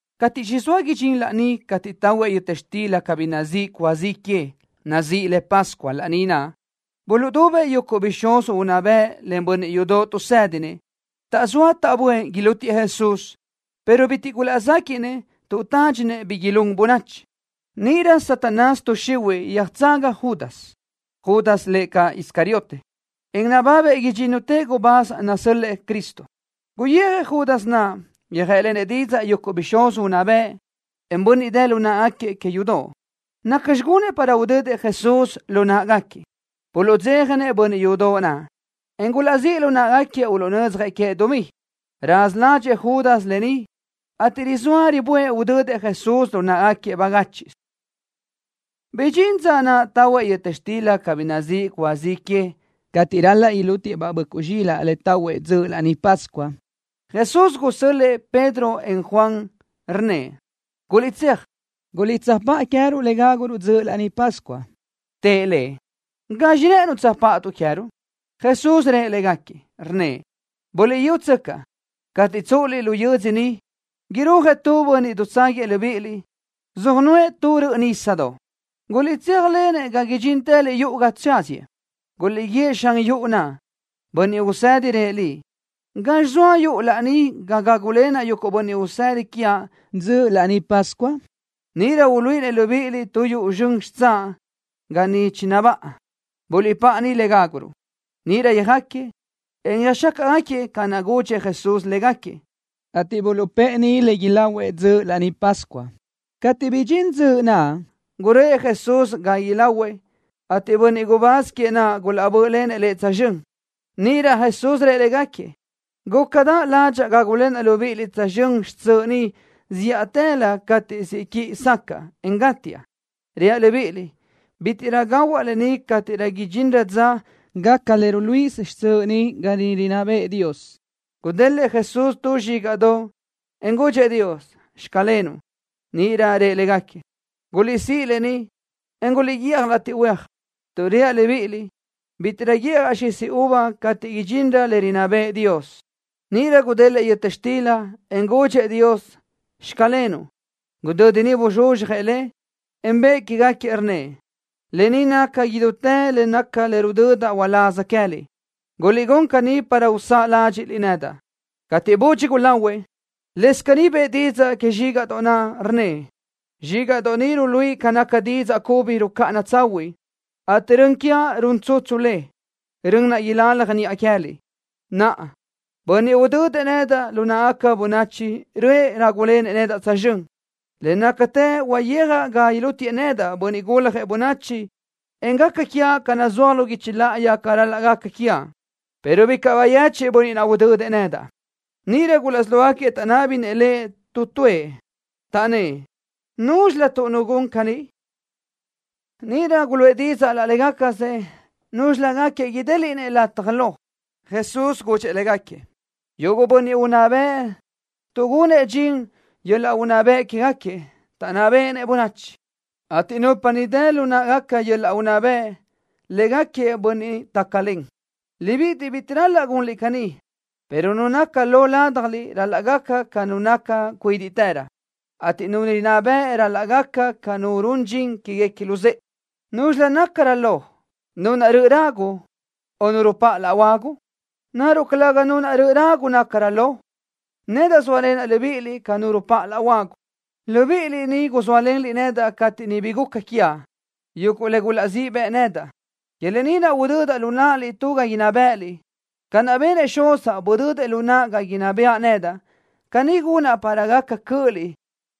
Cateʼ chizóa idxín laní cateʼ tahuëʼ yöta xtila cabí nazíʼi cúa zi que, nazíʼi le Pascua laní naʼ, buluʼdubëʼ yuguʼ bixúz unná bëʼ len bönniʼ yudoʼ tuʼsédinëʼ. Taʼzóa taʼböʼë ilútiëʼ Jesús, pero bitiʼ gulaʼzéquiʼnëʼ tuʼ tádxinëʼ bi ilún bönachi. Níʼirö Satanás tuʼ xihuiʼ yöjtsaga Judas. Judas lëʼ caʼ Iscariote, en nababëʼ idxínnutëʼ gubáz nasö́l-lëʼë Cristo. Guyijëʼ Judas naʼ, yöjë́ʼlenëʼ didzaʼ yuguʼ bixúz unná bëʼ, en bönniʼ dë lu náʼagaquiëʼ que yudoʼ, nacxi gunëʼ para udödëʼ Jesús lu náʼagaquiëʼ. Buluʼdzéjanëʼ bönniʼ yudoʼ naʼ, en gulaʼzíʼ lu náʼagaquiëʼ uluʼnödzjëʼ queëʼ dumí. Raza ládxëʼë Judas lë ni, ateʼ rizóa riböʼë udödëʼ Jesús lu náʼagaquiëʼ bagáchiʼsö. Bidxín dza naʼ tahuëʼ yöta xtila cabí nazíʼi cúa zi que, cateʼ ral-laʼ ilútiëʼ-baʼ böʼcuʼ zxilaʼ le tahuëʼ dzöʼ Laní Pascua. Jesús gusö́l-lëʼë Pedro, en Juan, rnnëʼ: —Guliʼtséaj, guliʼtsöjpáʼa queë́ruʼ le gáguruʼ dzöʼ Laní Pascua. Tëʼ Lëʼ: —¿Gazxi rë́ʼënuʼ tsöjpáʼatuʼ queë́ruʼ? Jesús rëʼ légaquiëʼ, rnnëʼ: —Buliʼyútsöcaʼ, cateʼ tsúʼuliʼ lu yödzö ni, irúajëʼ tu bönniʼ dutságuiëʼ libíʼiliʼ, söjnuʼë tu röʼö nisa. Guliʼtséajlenëʼ ga idxíntëliʼ yuʼu ga tsáziëʼ. Guliʼguíëʼ xan yuʼu naʼ: “Bönniʼ Usedi rëʼ liʼ: ¿Gazxi zoa yuʼu laní ga gágulenaʼ yuguʼ bönniʼ usëda quiaʼ dzöʼ Laní Pascua?” Níʼirö uluíʼinëʼ libíʼiliʼ tu yuʼu zxön xitsáʼ ga niʼ chinabáʼa. Buliʼpáʼa niʼ le gáguruʼ. Níʼirö yöjáquiëʼ, en yöjxácaʼgaquiëʼ ca naʼ chigudxëʼ Jesús légaquiëʼ, ateʼ buluʼpë́ʼë niʼ le ilahuëʼ dzöʼ Laní Pascua. Cateʼ bidxín dzöʼ naʼ, guröʼë Jesús ga ilahuëʼ, ateʼ bönniʼ gubáz queëʼ naʼ gulaʼbö́ʼlenëʼ Lëʼ tsözxö́n. Níʼirö Jesús rëʼ légaquiëʼ: —Gúcadaʼ ládxaʼa gágulenaʼ libíʼiliʼ tsözxö́n xtsöʼ ni zíʼatëlö cateʼ siʼ quiʼi sacaʼa, en gátiaʼ. Reaʼ libíʼiliʼ: Bítiʼrö gahuaʼ lë ni cateʼ idxinrö dza gaca le ruluíʼisö xtsöʼ ni ga niʼ rinná bëʼë Dios. Gudélëʼë Jesús tu zxígaʼdoʼ, en gudxëʼ Dios: “Xclenuʼ.” Níʼirö rëʼ légaquiëʼ: —Guliʼsíʼ lë ni, en guliʼguíʼaj latiʼ huéaj, tuʼ reaʼ libíʼiliʼ: Bítiʼrö guíʼjaʼ xisi uva cateʼ idxinrö le rinná bëʼë Dios. Níʼirö gudélëʼë yöta xtila, en gudxëʼ Dios: “Xclenuʼ.” Gudödi niʼ buzxuzxjëʼ le, en bëʼë que queë́gaquiëʼ, rnnëʼ: —Lë ni naca idútë le nacaʼ le rudödaʼ uláz queë́liʼ. Guliʼgún caní para usáʼ ládxiʼliʼ nedaʼ. Cateʼ budxi gulahuëʼ, lëscaʼ caní bëʼë didzaʼ que zxígaʼdoʼ naʼ, rnnëʼ: —Zxígaʼdoʼ ni ruluíʼi ca naca didzaʼ cubi rucáʼana tsahuiʼ, ateʼ rön quiaʼ run tsutsu le, rön naʼ ilalaj niʼa queë́liʼ. ’Naʼa, bönniʼ naʼ udödëʼ nedaʼ lu náʼagaca bönachi röʼë rágulenëʼ nedaʼ tsözxö́n. Le nácatë huayijaʼ ga ilútiëʼ nedaʼ, Bönniʼ Guljëʼ Bönachi, en gaca quiaʼ ca naʼ nazúaj lu guichi láʼayi ca ral-laʼ gaca quiaʼ, pero bicaʼ bayechiʼ bönniʼ naʼ udödëʼ nedaʼ. Níʼirö gulaʼsí lógaquiëʼ taʼnábinëʼ Lëʼ tu tuëʼ, taʼnnë́ʼ: —¿Núzxilötuʼ nu gun caní? Níʼirö guluʼë didzaʼ laʼ légacasëʼ núzxilögaquiëʼ idéliʼnëʼ lataj lo. Jesús gudxëʼ légaquiëʼ: —Yuguʼ bönniʼ unná bëʼ tuʼgunëʼ dxin yöl-laʼ unná bëʼ quégaquiëʼ, taʼnná béʼenëʼ bönachi, ateʼ nupa ni dë lu náʼagaca yöl-laʼ unná bëʼ, lë́gaquiëʼ bönniʼ tácalen. Libíʼiliʼ bitiʼ ral-laʼ gunliʼ caní, pero nu naca lo ládjaliʼ ral-laʼ gaca ca nu naca cuídiʼtërö, ateʼ nu rinná bëʼ ral-laʼ gaca ca nu run dxin quéguequi luzë́ʼe. ¿Núzxilö naʼ nácarö lo, nu naʼ röʼö ragu, o nu rupáʼ laʼ huagu? ¿Naruʼ calëga nu naʼ röʼö ragu nácarö lo? Nedaʼ zóalenaʼ libíʼiliʼ ca nu rupáʼ laʼ huagu. ’Libíʼiliʼ ni guzóalenliʼ nedaʼ cateʼ niʼ bi guca quiaʼ, yuguʼ le gulaʼzíʼ bëʼ nedaʼ. Que lë ni naʼ udödaʼ lu náʼaliʼ tu ga inná bë́ʼëliʼ, ca naʼ benëʼ Xuzaʼ, budödëʼ lu naʼa ga inná bëʼa nedaʼ. Caní gunaʼ para gaca cö́ʼöliʼ,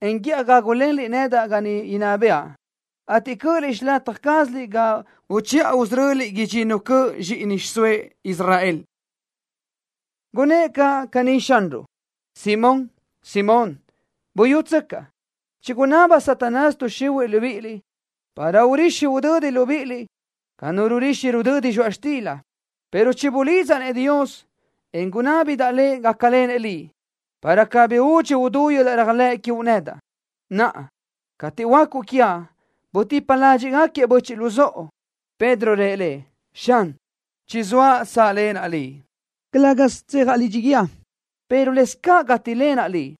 en guíʼaj gágulenliʼ nedaʼ ga niʼ inná bëʼa, ateʼ cö́ʼöliʼ xilataj cázaliʼ ga uchiʼa usöröliʼ idxinnu cöʼ zxíʼini xiʼsóëʼ Israel. Gunnë́ʼ caʼ caní Xanruʼ: —Simón, Simón. Buyútsöcaʼ. Chigunaba Satanás tuʼ xihuiʼ libíʼiliʼ, para urixi udödi libíʼiliʼ ca nu rurixi rudödi zxoaʼ xtila, pero chibulidzaʼ-nëʼ Dios, en gunábidaʼ Lëʼ gácalenëʼ liʼ, para cabí údxi udú yöl-laʼ réajlëʼ quiuʼ nedaʼ. Naʼa, cateʼ huöácuʼ quiaʼ, butipa ládxiʼgaquiëʼ böchiʼ luzóʼo. Pedro rëʼ Lëʼ: —Xan, chizóaʼ sáʼlenaʼ Liʼ, calë́gasö tsejaʼ lidxi guíë, pero lëscaʼ gátilenaʼ Liʼ.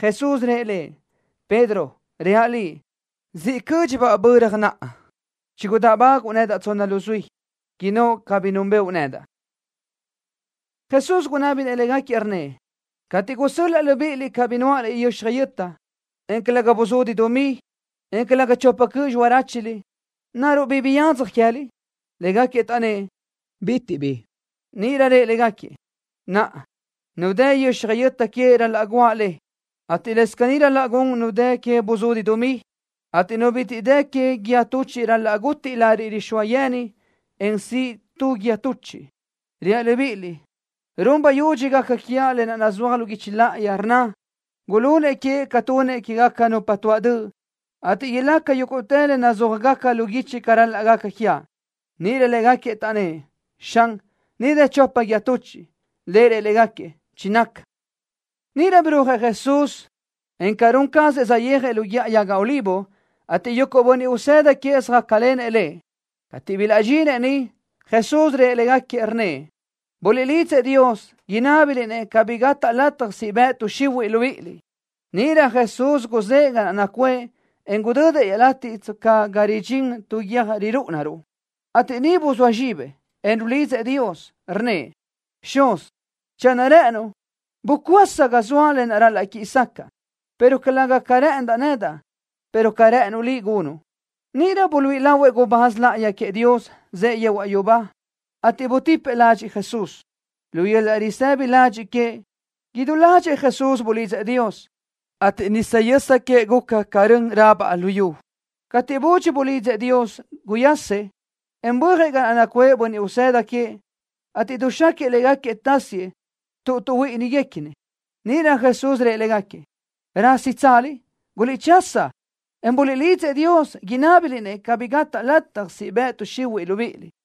Jesús rëʼ lëʼ: —Pedro, reaʼ liʼ: Zíʼalö cö́dxibaʼ böra naʼa, chigudáʼbaguʼu tsonna luzuí, innóʼ cabí núnbëʼu nedaʼ. Jesús gunábinëʼ légaquiëʼ, rnnëʼ: —Catiʼ gusö́l-laʼa libíʼiliʼ cabí nuáʼaliʼ yöxaj yöta, en calëga buzudi dumí, en calëga chopa cöʼ xiráchuliʼ, ¿naruʼ bi biyadzaj queë́liʼ? Légaquiëʼ taʼnnë́ʼ: —Bitiʼ bi. Níʼirö rëʼ légaquiëʼ: —Naʼa, nu dë yöxaj yöta que ral-laʼ guáʼ le, ateʼ lëscaʼ caní ral-laʼ gun nu dë que buzudi dumí, ateʼ nu bitiʼ dë que guíë tuchiʼ ral-laʼ gutiʼ lariʼ rixóa yeni, en siʼ tu guíë tuchiʼ. Reaʼ libíʼiliʼ: Run bayudxi gaca quiaʼ lë naʼ nazúaj lu guichi láʼayi, rnna: “Gulunëʼ queëʼ ca tunëʼ quégaca nupa tuaʼ döʼ”, ateʼ ilaca yúguʼtë le nazúajgaca lu guichi ca ral-laʼ gaca quiaʼ. Níʼirö légaquiëʼ taʼnnë́ʼ: —Xan, ni dë chopa guíë tuchiʼ. Lëʼ rëʼ légaquiëʼ: —Chinaca. Níʼirö birúajëʼ Jesús, en ca run cazëʼ saʼyéajëʼ lu Guíʼa Yaga Olivo, ateʼ yuguʼ bönniʼ usëda queëʼ söjácalenëʼ Lëʼ. Cateʼ bilaʼdxinëʼ niʼ, Jesús rëʼ légaquiëʼ, rnnëʼ: —Buliʼlídzëʼ Dios, inábiliʼ-nëʼ cabí gataʼ lataj siʼ bëʼ tuʼ xihuiʼ libíʼiliʼ. Níʼirö Jesús guzë́ʼë ga naʼ nacuʼë, en gudödëʼ iaʼlatiʼ tsca ga ridxín tu guiö́j rirúʼuniruʼ, ateʼ niʼ buzóa zxibëʼ, en rulidzëʼ Dios. Rnnëʼ: —Xúz, channö rë́ʼënuʼ, bucuása ga zoaʼ lë naʼ ral-laʼ quíʼi sacaʼa, pero calëga ca rë́ʼëndaʼ nedaʼ, pero ca rë́ʼënuʼ Liʼ gunuʼ. Níʼirö buluíʼi lahuëʼ gubáz láʼayi queëʼ Dios, zëʼë yehuaʼ yubá, ateʼ butipëʼ ládxëʼë Jesús. Lu yöl-laʼ risëbi ladxiʼ queëʼ, idú ládxëʼë Jesús bulidzëʼ Dios, ateʼ nisa yösa queëʼ guca ca rön rabaʼ luyú. Cateʼ budxi bulidzëʼ Dios, guyasëʼ, en bö́ajëʼ ga naʼ nacuʼë bönniʼ usëda queëʼ, ateʼ duxáquiëʼ légaquiëʼ tásiëʼ tuʼ tuʼhuíʼinigaquiëʼ. Níʼirö Jesús rëʼ légaquiëʼ: —¿Rásitsaliʼ? ¡Guliʼchasa, en buliʼlidzëʼ Dios! Inábiliʼ-nëʼ cabí gataʼ lataj siʼ bëʼ tuʼ xihuiʼ libíʼiliʼ.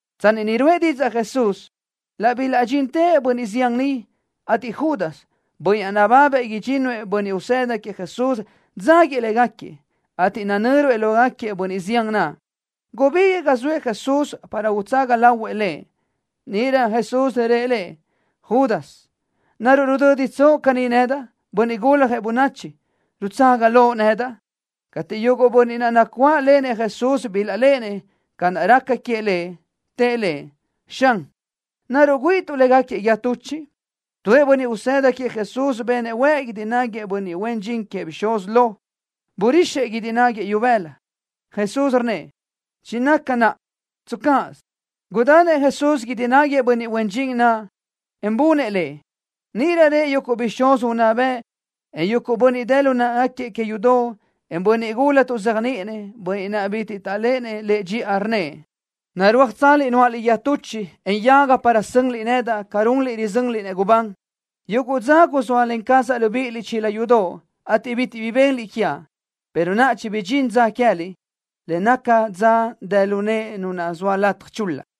Tsanni niʼ ruʼë didzaʼ Jesús, laʼ bilaʼdxintëʼ bönniʼ zián niʼ, ateʼ Judas, bönniʼ naʼ nababëʼ idxínnuëʼ bönniʼ usëda queëʼ Jesús dzáguiëʼ légaquiëʼ, ateʼ nanö́ruëʼ lógaquiëʼ bönniʼ zián naʼ. Gubíguiʼë ga zoëʼ Jesús para utsaga lahuëʼ Lëʼ. Níʼirö Jesús rëʼ lëʼ: —Judas, ¿naruʼ rudö́ditsoʼ caní nedaʼ, Bönniʼ Guljëʼ Bönachi, rutsaga loʼ nedaʼ? Cateʼ yuguʼ bönniʼ naʼ nacuáʼlenëʼ Jesús bilaʼléʼenëʼ ca naʼ raca queëʼ Lëʼ, tëʼ Lëʼ: —Xan, ¿naruʼ güíʼituʼ légaquiëʼ guíë tuchiʼ? Tuëʼ bönniʼ usëda queëʼ Jesús benëʼ huëʼ guídi náguiëʼ bönniʼ huen dxin queëʼ bixúz lo. Burixëʼ guídi náguiëʼ ibëla. Jesús rnnëʼ: —Chinaca naʼa. Tscaʼ gaz. Gudanëʼ Jesús guídi náguiëʼ bönniʼ huen dxin naʼ, en bunëʼ le. Níʼirö rëʼ yuguʼ bixúz unná bëʼ, en bönniʼ dë lu náʼagaquiëʼ que yudoʼ, en bönniʼ gula tuʼzéajniʼinëʼ, bönniʼ naʼ bitiʼ taʼléʼenëʼ Lëʼ dxiʼa, rnnëʼ: —¿Narúajtsaliʼ nuáʼaliʼ guíë tuchiʼ, en yaga para sönliʼ nedaʼ ca runliʼ rizönliʼ-nëʼ gubán? Yuguʼ dza guzóalen cazaʼ libíʼiliʼ chila yudoʼ, ateʼ bitiʼ bi benliʼ quiaʼ, pero naʼa chibidxín dza queë́liʼ, le naca dza dë lu nëʼe nu naʼ zoa lataj chul-la.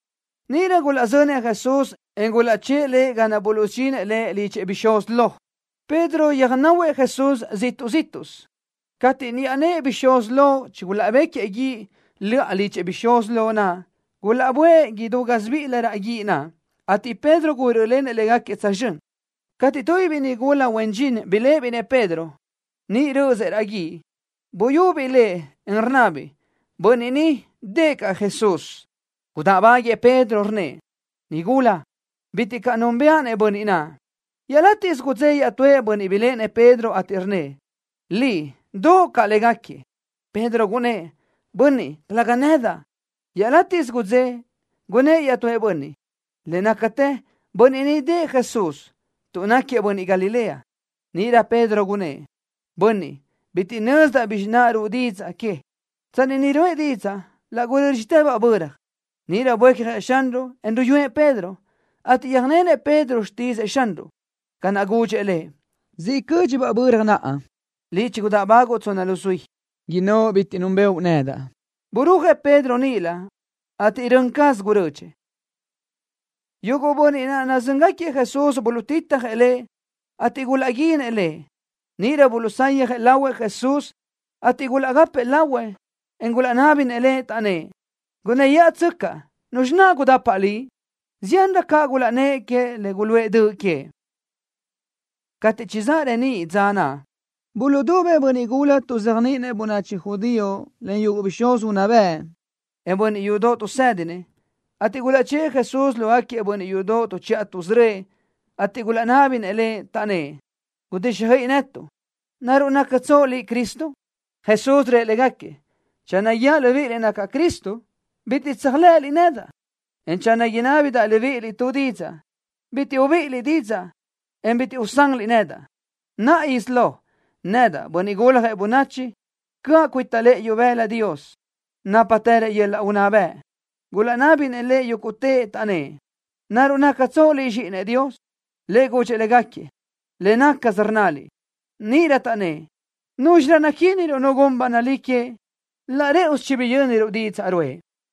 Níʼirö gulaʼzönëʼ Jesús, en gulaʼchë́ʼë Lëʼ ga naʼ buluʼsudxinëʼ Lëʼ lidxëʼ bixúz lo. Pedro yöjnahuëʼ Jesús ziʼtuʼ zíʼtuʼsö. Cateʼ niʼa nëʼë bixúz lo chigulaʼbéquiëʼ guíʼ löʼa lidxëʼ bixúz lo naʼ, gulaʼböʼë idú gásibiʼilö raʼ guíʼ naʼ, ateʼ Pedro gurö́ʼlenëʼ légaquiëʼ tsözxö́n. Cateʼ tubiʼ biʼi nigula huen dxin biléʼebiʼ-nëʼ Pedro, niʼ rö́ʼösëʼ raʼ guíʼ, buyubiʼ lëʼ, en rnnabiʼ: —Bönniʼ ni dëʼë caʼ Jesús. Gudáʼbaguiëʼ Pedro, rnnëʼ: —Nigúla, bitiʼ caʼ núnbëʼa-nëʼ bönniʼ naʼ. Iaʼlatiʼ gudzé iaʼtúëʼ bönniʼ biléʼenëʼ Pedro, ateʼ rnnëʼ: —Liʼ doʼo caʼ légaquiëʼ. Pedro gunnë́ʼ: —Bönniʼ, calëga nedaʼ. Iaʼlátiʼsö gudzé, gunnë́ʼ iaʼtúëʼ bönniʼ: —Le nácatë bönniʼ ni dëʼë Jesús, tuʼ náquiëʼ bönniʼ Galilea. Níʼirö Pedro gunnë́ʼ: —Bönniʼ, bitiʼ nözdaʼ bizxi naʼ ruʼu didzaʼ que. Tsanni niʼ ruʼë didzaʼ ni, laʼ gurö́dxitëbaʼ böra. Níʼirö buécjëʼ Xanruʼ, en ruyúëʼ Pedro, ateʼ yöjnenëʼ Pedro xtídzëʼë Xanruʼ, ca naʼ gudxëʼ lëʼ: “Zíʼalö cö́dxibaʼ böra naʼa, liʼ chigudáʼbaguʼu tsonna luzuí, innóʼ bitiʼ núnbëʼu nedaʼ.” Burúajëʼ Pedro níʼilö, ateʼ rön caz gurödxëʼ. Yuguʼ bönniʼ naʼ nazö́ngaquiëʼ Jesús buluʼtitjëʼ Lëʼ, ateʼ gulaʼguínëʼ Lëʼ. Níʼirö buluʼsayjëʼ lahuëʼ Jesús, ateʼ gulaʼgápëʼë lahuëʼ, en gulaʼnábinëʼ Lëʼ, taʼnnë́ʼ: —¡Gunnë́yaʼatsöcaʼ! ¿Nuzxi naʼ gudapaʼ Liʼ? Ziánrö caʼ gulaʼnnë́ʼ queëʼ le guluʼë döʼ queëʼ. Cateʼ chizáʼ reníʼ dza naʼ, buluʼdubëʼ bönniʼ gula tuʼzéajniʼinëʼ bönachi judío len yuguʼ bixúz unná bëʼ, en bönniʼ yudoʼ tuʼsédinëʼ, ateʼ gulaʼchë́ʼë Jesús lógaquiëʼ bönniʼ yudoʼ tuʼchiʼa tuʼsörö́ëʼ, ateʼ gulaʼnábinëʼ Lëʼ, taʼnnë́ʼ: —Gudíxjöiʼi netuʼ. ¿Naruʼ nactsoʼ Liʼ Cristo? Jesús rëʼ légaquiëʼ: —Channö guíaʼ libíʼiliʼ nacaʼ Cristo, bitiʼ tséajlëʼëliʼ nedaʼ, en channö inábidaʼ libíʼiliʼ tu didzaʼ, bitiʼ ubíʼiliʼ didzaʼ, en bitiʼ usanliʼ nedaʼ. Naʼa isí lo, nedaʼ, Bönniʼ Guljëʼ Bönachi, cöʼa cuita lëʼë ibëla Dios, nápatërëʼ yöl-laʼ unná bëʼ. Gulaʼnábinëʼ Lëʼ yúguʼtëʼ, taʼnnë́ʼ: —¿Naruʼ nactsoʼ Liʼ Zxíʼinëʼ Dios? Lëʼ gudxëʼ légaquiëʼ: —Le nácasö rnnaliʼ. Níʼirö taʼnnë́ʼ: —¿Núzxirö naquíniruʼ nu gun ba nalí queëʼ? Laʼ rë́ʼusö chibiyö́niruʼ didzaʼ ruʼë.